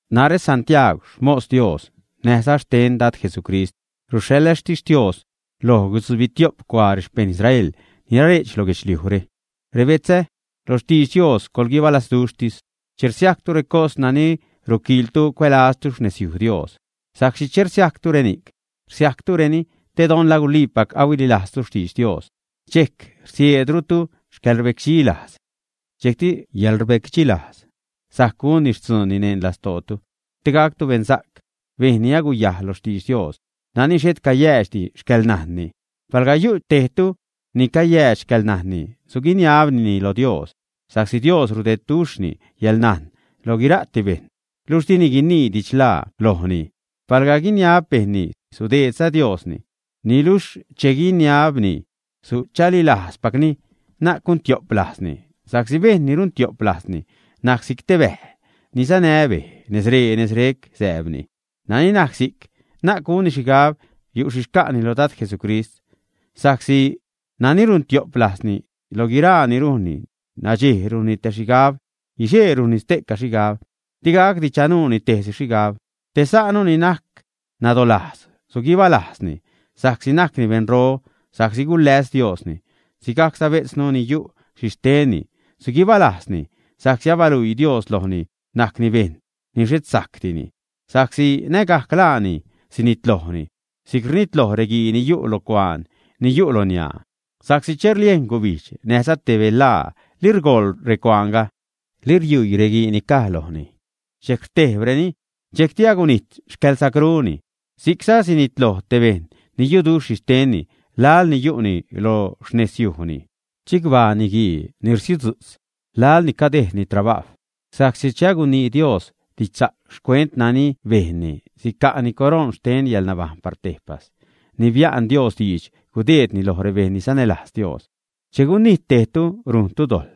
Narä Santiaag, xmos Dios näjza xten Dad Jesucrist, ruxhaḻä xtixtios loj guitzubitio'p cuaa rexpejṉ Israel ni nare'ch lo guedxliujre. Rebetzä lo xtidx Dios, coḻguibalazduxhtis che rsiajctu recos nani ruquiiltu cuälaztu xnezyuj Dios, sa'csi che rsiajctu reni'c, rsiajctureni te don la guliipac ahuililajztu xtidx Dios, dxejc rsieedrutu yäḻrbecdxi lajz. Dxejcti yäḻrbecdxilajz sajc gunni xtzuunni neṉ lastootu, te gactu beṉsa'c, bejṉ ni aguyajl lo xtidx Dios, nani xhet cayäädxdi xcäḻnajnni. Palga yu' tejtu ni cayäädx xcäḻnajnni, suguiniabnini lo Dios, sa'csi Dios rudeedduxhni yäḻnajn loj guira'ti bejṉ, luxh dini guinii didxlaa lojni. Palga guiniab bejṉni, sudeedza Diosni. Niluxh che guiniabni, suchalilajzpacni, na'c guntio'p lajzni, sa'csi bejṉ ni runtio'p lajzni najc si'c bäj ni sanä bej, nezree-nezre'c sääbni. Nani najc si'c, na'c gunni xhigab yu' xhi xca'ni lo Dad Jesucrist. Sa'csi nani runtio'p lajzni, lo guiraa ni rujnni nadxej rujnni tej xhigab, guixee rujnni xte'ca xhigab, di gacdi chanuuni tejsi xhigab. Te sa'nu ni najc nadolajz, suguibalajzni sa'csi najcni beṉro sa'csi guläs Diosni, sigajcza bejtznu ni yu' xhixtenni, suguibalajzni sa'csi abaluii Dios lojni najcni bejṉ ni xhet sajcdini, sa'csi nägajc laani sinitlojni si'c rnitloj reguii ni yu' lo cuaan ni yu' loniaa. Sa'csi che rliejn gubijdz näjza te belaa, li rgoḻ recuaanga, li riuii reguii ni caj lojni, dxejc rtejbreni, dxejcti agunijt xcäḻsacruni. Si'cza sinitloj te bejṉ ni yuduxh xhixtenni laḻ ni yu'ni lo xnezyujni. Chicbaa niguii ni rsiudzu'tz laḻ ni cadejdni trabajw, sa'csi che agunii Dios didxsa'c xcuent nani bejnni sica'ni coroṉ xten yäḻnabajṉ par tejpas ni bia'n Dios diidx gudeedni loj rebejṉ ni sanälajz Dios. Che gunijt tejtu, rujntu dojḻ,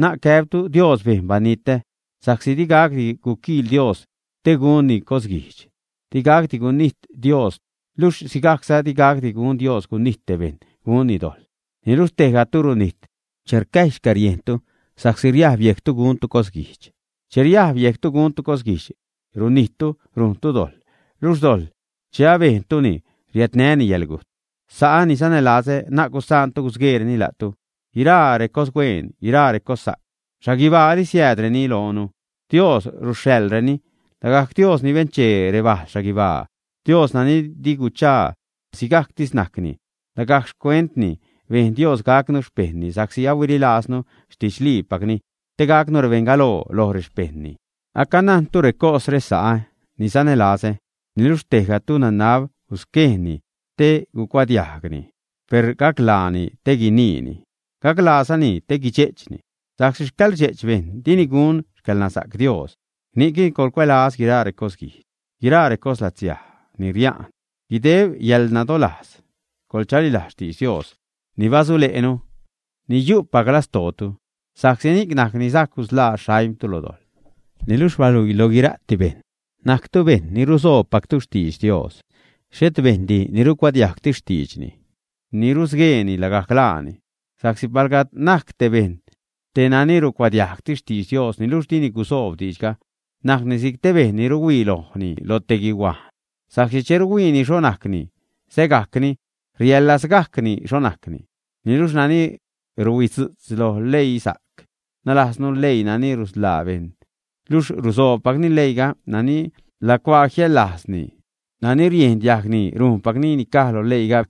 na'c gäbtu: “Dios bejn banitä”, sa'csi di gacdi quiquiil Dios te gunni cosguijdx, digacdi gunijt Dios, luxh sigajcza di gacdi gun Dios gunijt te bejṉ, gunni dojḻ. Niluxh tejgatu runijt che rcäjy xcäriejntu sa'csi riajb yejctu guntu cosguijdx. Che riajb yejctu guntu cosguijdx, runijttu rujntu dojḻ, luxh dojḻ che abejntuni, riädnäni yäḻgujt. Sa'ä ni sanälazä, na'c gusaantu gusgueereni la'tu. Guiraa recoshueen, guiraa recossa'c xhaguibaali siäädreni loonu; Dios ruxhaḻreni, lagajc Dios ni benchee rebajl xhaguibaa, Dios nani di guchaa, sigajctis najcni. Lagajc xcuentni bejn Dios gacnu xpejṉni sa'csi huililajznu xtidxliipacni, te gacnu rebeṉ galoo loj rexpejṉni. Acanajntu recosre, sa'ä ni sanälazä. Niluxh tejgatu nanab gusquejṉni te gucuadiajgni, per gaclaani te guiniini, gaclaazani te guidxe'chni, sa'csi xcäḻrdxe'ch bejṉ dini gun xcäḻnasa'c Dios. Ni'cni coḻcuälaz guiraa recosguijdx, guiraa recoslatsiaj ni ria'n. Guideb yäḻnadolajz coḻchalilajz xtidx Dios ni basule'nu, ni yu'pac lastootu, sa'csi ni'c najc ni sajc gusḻaa xaimtu lo dojḻ. Niluxh baluii lo guira'ti bejṉ najctu bejṉ ni rusoobpactu xtidx Dios, xhet bejṉdi ni rucuadiajgtis xtiidxni, ni rusgueeni lagajc laani. Sa'csi palga najc te bejṉ te nani rucuadiajgtis xtidx Dios, niluxh dini gusoob diidxga, najcni si'c te bejṉ ni ruhuii lojni loj te guihuajn. Sa'csi che ruhuiini xho najcni, sägajcni, riaḻlazgajcni xho najcni. Niluxh nani ruhuidzu'tz lo leisa'c, nalajznu leii nani rusḻaa bejṉ, luxh rusobpacni leiiga, nani lacuaa jiaḻlajzni nani riejn diajgni, rujnpacni ni caj lo leiiga,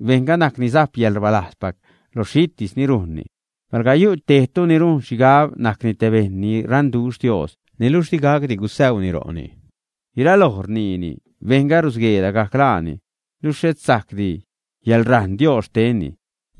bejṉga najc ni sajp yäḻrbalajzpac lo xhitis ni rujnni. Palga yu' tejtu ni rujn xhigab najcni te bejṉ ni raṉduxh Dios, niluxh di gacdi gusäuni ro'ni, guiraloj rniini, bejṉga rusguee lagajc laani, luxh xhet sajcdi yäḻrajṉ Dios xtenni.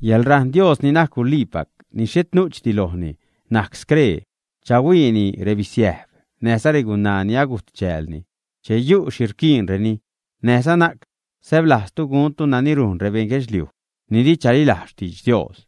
Yäḻrajṉ Dios ni najc guliipac, ni xhet nu'chdi lojni najc scree: chahuiini rebisiäjb, näjza regunaa ni agujt chäälni che yu' xhi rquiinreni, näjza na'c säblajztu guntu nani rujn rebeṉ guedxliuj ni di chalilajz xtidx Dios.